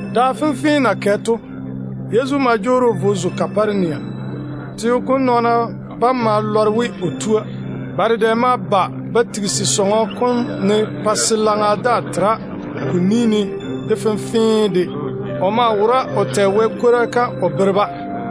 Da fenfee na kɛ to, Yezu ma jwoori o vo o zo Kaparenia. Teo kom nɔɔna bam ma lɔre we o tu sɔŋɔ. Ba dedɛ ma ba ba tigisi sɔŋɔ kom ne pa se pwola daa tera ko ni ne de fenfee de. O maa wora o tɛ Wɛ kwora kam o bere-ba.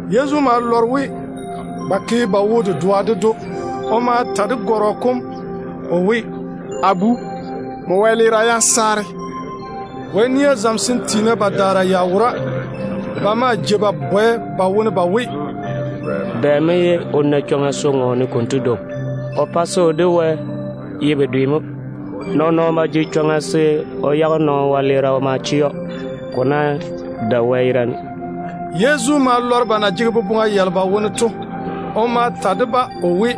Yezu ma lɔre we ba ke ba wo-dedoa ded‑o. O ma ta de gɔrɔ kom o we, “A bu, nmo wɛleera yam saare.” Wɛ nia zamesem tiina badaara ya wora. Ba maa jei ba bwɛ ba wone ba we, “Bɛ mo ye o na chwoŋa se o ŋɔɔne konto dwoŋi? O pae se o de Wɛ ye bedwe mo. Nɔɔn-nɔɔno ba jege chwoŋa se o yage nɔɔno wɛleera o ma chɛ‑o, ko ná dae Wɛ yerane.” Yezu ma lɔre ba na jege boboŋa yalo ba wone to. O ma ta de-ba o we,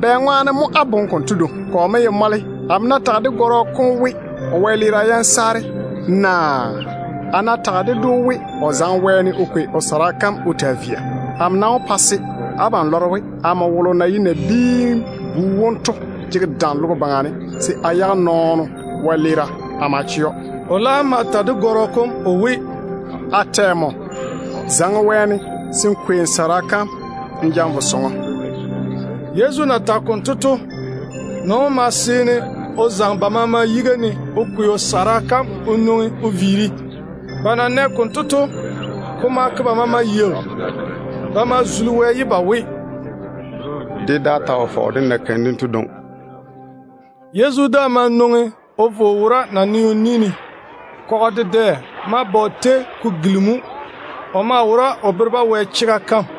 “Bɛŋwaane mo á boŋe konto dwoŋi? Kɔ mo ye mɔle, amo ná tage de gɔrɔ kom we o wɛleera yam saare, naa a ná tage ded‑o we o zaŋe wɛɛne o kwei o gungwolo kom o taa via? Amo nam wó pa se abam lɔre we amo wolo na ye Nabiin-bu wom to jege dam logo baŋa ne se a yage nɔɔno wɛleera a ma chɛ‑o.” O laam ma ta de gɔrɔ kom o we, “A tɛ nmo, zaŋe wɛɛne n kwei n gungwolo kom n ja n vo sɔŋɔ.” Yezu na tage konto to, nɔɔno wom ma seene o zaŋe ba maama yiga ne o kwei o gungwolo kom o nwoŋi o viiri. Ba na nɛ konto to, ko ma ke ba maama yaau. Ba ma tei Wɛ ye ba we, “Dé daa ta wo fɔge dé na keim dento dwoŋi.” Yezu daa ma nwoŋi o vo o wo naneo ni ne. Kɔgɔ dedɛ ma ba o tei ko gilimi‑o. O maa wora o bere-ba Wɛ chega kam.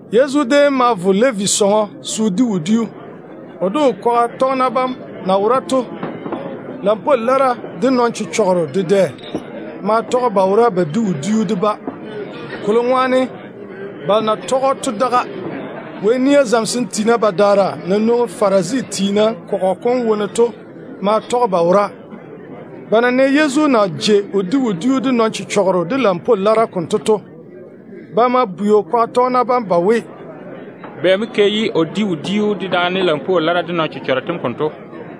Yezu déem ma vo Levi sɔŋɔ se o di wodiu. O de o kwaga tɔgena bam na wora to, lampwoo lara de nɔn-chechɔgero dedɛ maa tɔge ba wora ba di wodiu de-ba, kolo ŋwaane balo na tɔge‑o to daga. Wɛ nia zamesem tiina badaara na nwoŋi Farisi tiina kɔgɔ kom wone to maa tɔge ba wora. Ba na nɛ Yezu na jei o di wodiu de nɔn-chechɔgero de lampwoo lara konto to, ba ma bwei o kwaga tɔgena bam ba we, “Bɛ mo ke ye o di wodiu dedaane lampwoo lara de nɔn-chechɔgero tem konto?”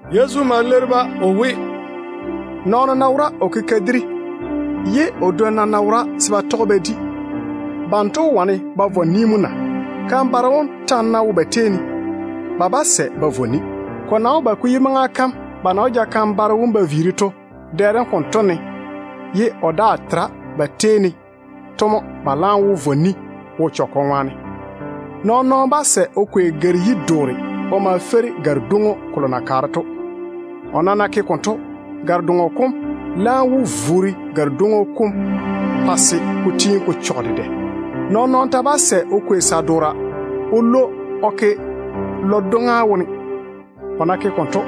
Yezu ma leiri-ba o we, “Nɔɔno ná wora o ke kadiri, ye o dwonna ná wora se ba tɔge ba di, banto wó wane ba vɔ ni na? Kan-baro wom ta ná wo ba tei ne, ba bá sɛ ba vɔ ni. Ko nam wó ba ko yi maŋa kam ba na wó ja kan-baro wom ba viiri to. Dɛ dem konto ne ye o daa tera ba tei ne to mo ba laam wó vɔ ni wo-chechɔgɔ ŋwaane. Nɔɔn-nɔɔno bá sɛ o kwei gare-yi-doore o ma feiri gare-dwoŋo kolo na kaare to. O nam ná ke konto, gare-doŋo kom laam wó vuuri gare-dwoŋo kom pa se ko tiini ko chɔge dedɛ. Nɔɔn-nɔɔno ta bá sɛ o kwei sa-doora o lwo o ke lɔ-dwoŋa wone. O ná ke konto,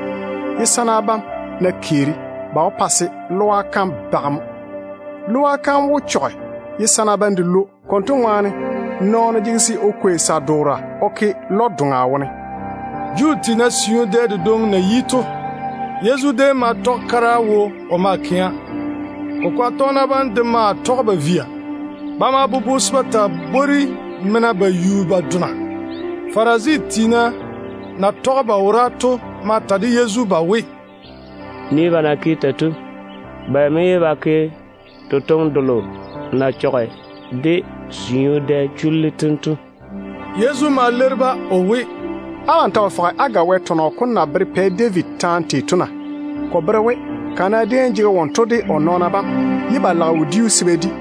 ye sana bam ná keeri, ba wó pa se lɔa kam bage mo. Lɔa kam wó chɔge ye sana bam de lwo ba yage. Konto ŋwaane nɔɔno maŋe se o kwei sa-doora o ke lɔ-doŋa wone mo.” Juu tiina siu dɛ dedwoŋi na yi to, Yezu déem ma tɔge kara wo o maa kɛa. O kwaga tɔgena bam de maa tɔge ba via. Ba ma bobo se ba taa bwori mena ba yu ba dona. Farisi tiina balo na tɔge ba wora to ma ta de Yezu ba we, “Nii ba na ke tei to! Bɛ mo ye ba ke totoŋe delo na chɔge dé siu dɛ chullu tem to?” Yezu ma leiri-ba o we, “Abam ta wo fɔge á ga Wɛ tɔnɔ kom na bere Pɛ David taane tei to na? Ko bere we kana déem jege wonto de o nɔɔna bam ye ba lage wodiu se ba di.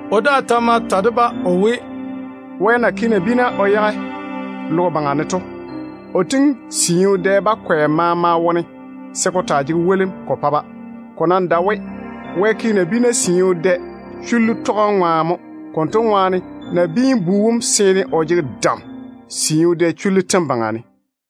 O daa ma ta de-ba o we, “Wɛ na ke nabiina o yage logo baŋa ne to, o tiŋi siu dɛ bakwɛ maama wone se ko taa jege wolim mo ko pa-ba mo. Ko nam dae we Wɛ ke nabiina siu dɛ chullu tɔgem ŋwaane mo. Konto ŋwaane Nabiin-bu wom ta jege dam siu dɛ chullu tem baŋa ne.”